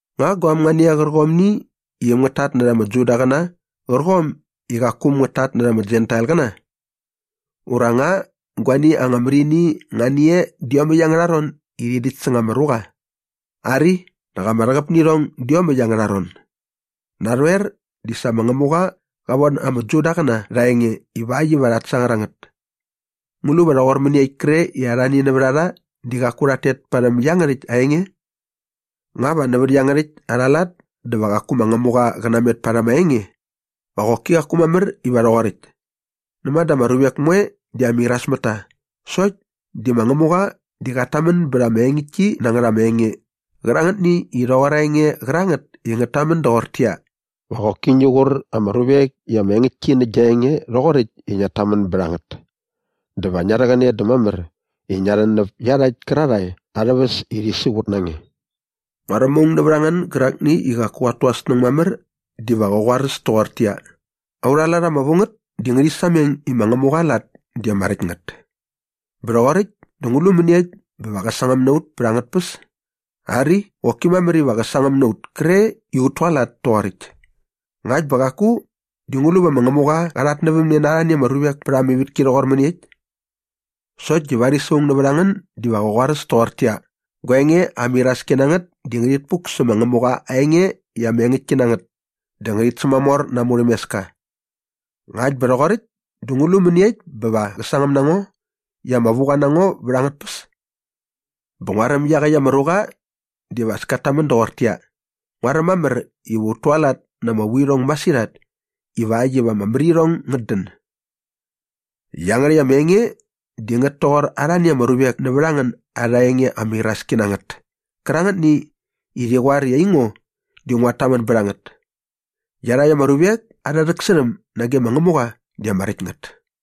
Nga guaäm nga ni e qärqomni i äm ngät tatnärha ama Judaqäna qärqom i qaku äm ngät tatnärha ama Jentailqäna? Ura nga guani anga mär ini nga ni e dä iomäkt angärha ron i rhi däkt säng ama ruqa? Ari, nak ama rhäqäp nä irhong dä iomäkt angärha ron. Narhoer di sa ma Ngämuqa qa von ama Judaqäna rha aa enge ivakt iva rhat sangar a ngät. Ngu lu va rhoqor mäniekt kre i arhani nävät a rha di qaku rhat tet parhäm iangärhäkt aa enge? Nga va nävät iangärhäkt arha lat dä va qaku ma Ngämuqa qä namet parhäm aa enge? Va qoki qaku mamär iva rhoqoräkt. Näma dä ama ruvek moe di ama irasmätta sokt di ma Ngämuqa di qat tamän bät ama engäktki na ngät ama enge qärangätni i rhoqor aa enge qärangät i ngät tamän doqortäqyia, “Va qoki ngi qur ama ruvek i ama engäktki nä gia enge rhoqoräkt i ngiat tamän bät a ngät dä va ngia rhäqäne dä mamär i ngia rhän näp iarhakt kärarhae arhä väs i rhi siqut na nge.” Nguaräm aung nävät a ngän gärakni i qaku qat tu aa snäng mamär diva qä snanbät toqortäqyia, “Aurha lat ama vu ngät di ngärhi sameng i ma Ngämuqa aa lat di ama räkt ngät. Bä rhoqoräkt dä ngu lu mäniekt bä va qä sangäm na ut pät angät tpäs?” Ari, qoki mamär iva qä sangäm na ut kre i ut tualat toqoräkt. Ngakt bä qaku di ngu lu va ma Ngämuqa qa rhatnävämne na arhani ama ruvek pät ama ivätki rhoqor mäniekt? Sokt di varis aung nävät a ngän diva qä snanbät toqortäqyia, “Gua enge ama iraski na ngät di ngärhit puk sä ma Ngämuqa aa enge i ama engäktki na ngät dä ngärhit sämamor na aa murhämeska. Ngakt bä rhoqoräkt dä ngu lu mäniekt bä va qä sangäm na ngo i ama vuqa na ngo vät angät tpäs?” Bä nguaräm iaqäkt ama ruqa diva as kat tamän doqortäqyia, “Nguaräm mamär iva ut tualat na ama vuirhong masirhat ivakt iva ama mär irhong ngät dän.” Iangärhäkt ama enge di ngät toqor arhani ama ruvek nävät a ngän arha enge ama iraski na ngät kärangätni i rhi qoar i aingo di nguat tamän bät a ngät. Iarhakt ama ruvek arhä rhäksärhäm nage ma Ngämuqa di ama räkt ngät.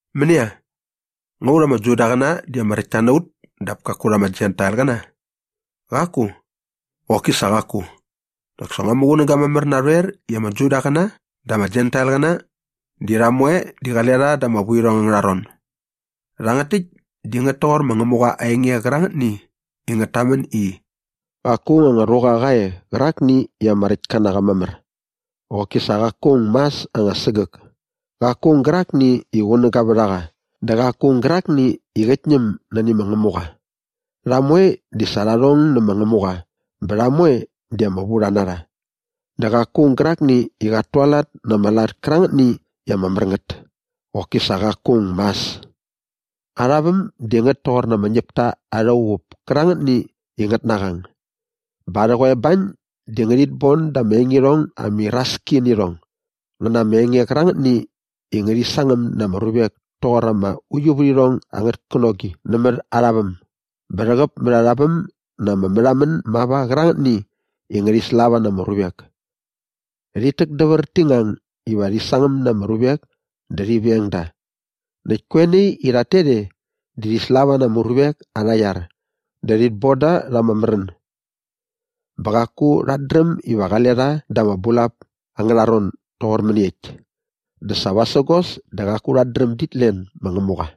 Mänia? Nga aiut ama Judaqäna di ama räktta na ut dap kaku rha ama Jentailqäna? Qaku! Qoki sa qaku! Nak sa ngua muqunäga mamär narhoer i ama Judaqäna dä ama Jentailqäna di rha moe di qale rha da ama vuirhong angärha ron. Rhangät täkt di ngät toqor ma Ngämuqa aa enge qärangätni i ngät tamän i, “Qaku aung anga ruqa qa e qärakni i ama räktka na qa mamär. Qoki sa qaku aung mas anga sägäk! Qaku aung gärakni i qunäga vät a qa dä qaku aung gärakni i qät ñäm nani ma Ngämuqa. Rha moe di sa rha rhong nä ma Ngämuqa bä rha moe di ama vurha na rha. Dä qaku aung gärakni i qat tualat na ama lat kärangätni i ama mär ngät. Qoki sa qaku aung mas! Arha väm di ngät toqor ama ñäpta arha uqup kärangätni i ngät naqang. Bä arhä qoebañ di ngärhit bon da ama engirhong ama iraski nä irhong ngä na ama enge qärangätni i ngärhi sangäm na ama ruvek toqor ama uiuvärhirhong angät känogi nämät arha väm bä rhäqäp mät arha väm na ama märhamän mava qärangätni i ngärhi slava na ama ruvek. Rhit täkdävär ti ngang iva rhi sangäm na ama ruvek dä rhi veng da. Näkt koe nai i rhat tet e di rhi slava na ama ruvek arha iar dä rhit bon da rha ama märän. Bä qaku rhat dräm iva qale rha da ama bulap angärha ron doqor mäniekt dä sa vasägos dä qaku rhat dräm dit len ma Ngämuqa.”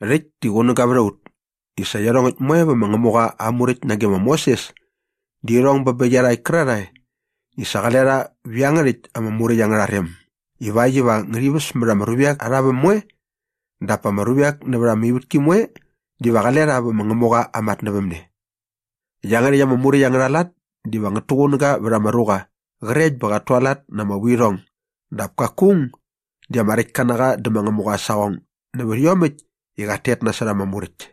Rhäkt di qunäga vät a ut i sa iarhongäkt moe vä ma Ngämuqa aa Muräkt nage ma Moses di irhong bä bä iarhakt kärarhae i sa qale rha vä iangärhäkt ama Muräkt angärha rem ivakt iva ngärhi väs mät ama ruvek arha väm moe dap pa ama ruvek nävät ama ivätki moe diva qale rha vä ma Ngämuqa aa matnävämne. Iangärhäkt ama Muräkt angärha lat diva ngät tuqunäga vät ama ruqa qrekt bä qat tualat na ama vuirhong dap kaku aung di ama räktka na qa dä ma Ngämuqa aa saqong nävät iomäkt i qat tet nasot ama Muräkt.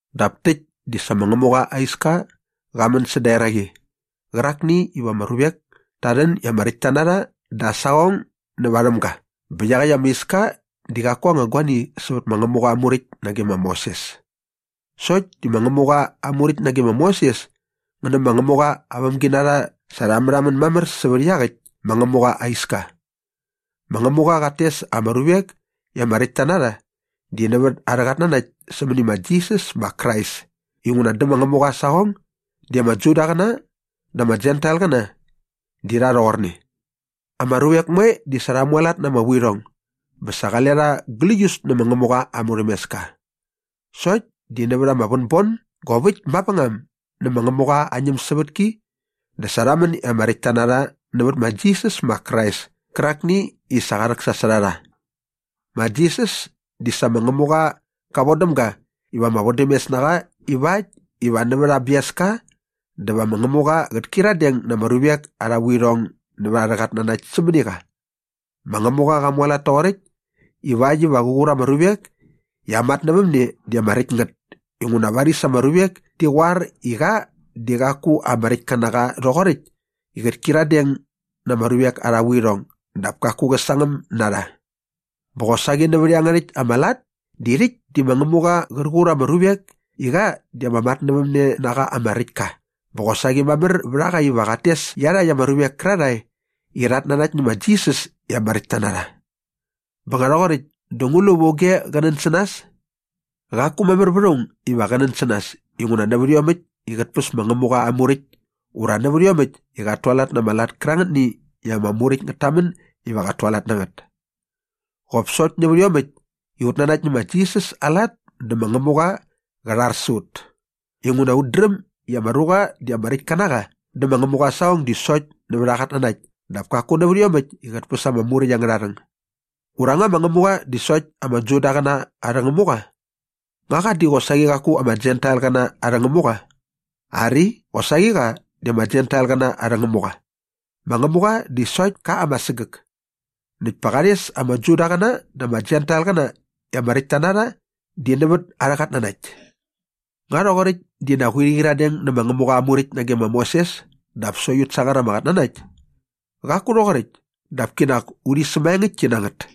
Dap täkt di sa ma Ngämuqa aa iska qa män säda eraqi qärakni iva ama ruvek ta rhän i ama räktta na rha da aa saqong nä varhäm ga bä iaqäkt ama iska di qaku anga guani sävät ma Ngämuqa aa Muräkt nage ma Moses. Sokt di ma Ngämuqa aa Muräkt nage ma Moses ngä nä ma Ngämuqa aa vämginarha sa rha märhamän mamär sävät iaqäkt ma Ngämuqa aa iska. Ma Ngämuqa qat tes ama ruvek i ama räktta na rha di nävät arhä qatnanakt sämäni ma Jisas ma Krais inguna dä ma Ngämuqa aa saqong di ama Judaqäna dä ama Jentailqäna di rha rhoqorne. Ama ruvek moe di sa rha mualat na ama vuirhong bä sa qale rha gläius nä ma Ngämuqa aa murhämeska. Sokt di nävät ama vänbon gop äkt mavängam nä ma Ngämuqa aa ñämsävätki dä sa rha män i ama räktta na rha nävät ma Jisas ma Krais kärakni i sa qa rhäksasot a rha. Ma Jisas di sa ma Ngämuqa qa vodäm ga iva ama vodämes na qa ivakt iva nävät aa biaska dä va ma Ngämuqa qät kyiradeng na ama ruvek arha vuirhong nävät arhä qatnanakt sämäni qa. Ma Ngämuqa qa mualat toqoräkt ivakt iva qär qur ama ruvek i aa matnävämne di ama räkt ngät inguna varis ama ruvek ti qoar i qa di qaku ama räkt ka na qa rhoqoräkt i qät kyiradeng na ama ruvek arha vuirhong dap kaku qä sangäm na rha. Bä qosaqi nävät iangärhäkt ama lat di rhäkt di ma Ngämuqa qär qur ama ruvek i qa di ama matnävämnenaqa ama räkt ka bä qosaqi mamär vät a qa iva qat tes iarhakt ama ruvek kärarhae i rhat nanakt nä ma Jisas i ama räktta na rha. Bä nga rhoqoräkt dä ngu lu va auge qä nän sä nas? Qaku mamär vät aung iva qä nän sä nas inguna nävät iomäkt i qät päs ma Ngämuqa aa Muräkt ura nävät iomäkt i qat tualat na ama lat kärangätni i ama Muräkt ngät tamän iva qat tualat na ngät. Qop sokt nävät iomäkt i ut nanakt nä ma Jisas aa lat dä ma Ngämuqa qä rhar sä ut inguna ut dräm i ama ruqa di ama räkt ka na qa dä ma Ngämuqa aa saqong di sokt nävät aa qatnanakt dap kaku nävät iomäkt i qät päs ama Muräkt angärha rhäng. Ura nga ma Ngämuqa di sokt ama Judaqäna arhä Ngämuqa? Nga qa di qosaqi qaku ama Jentailqäna arhä Ngämuqa? Ari, qosaqi qa di ama Jentailqäna arhä Ngämuqa. Ma Ngämuqa di sokt ka ama sägäk. Näkt pa qa rhes ama Judaqäna dä ama Jentailqäna i ama räktta na rha di nävät arhä qatnanakt. Nga rhoqoräkt dinak urhi qyiradeng nä ma Ngämuqa aa Muräkt nage ma Moses dap sokt ut sangar ama qatnanakt? Qaku rhoqoräkt dap kinak urhi sämaengäktki na ngät.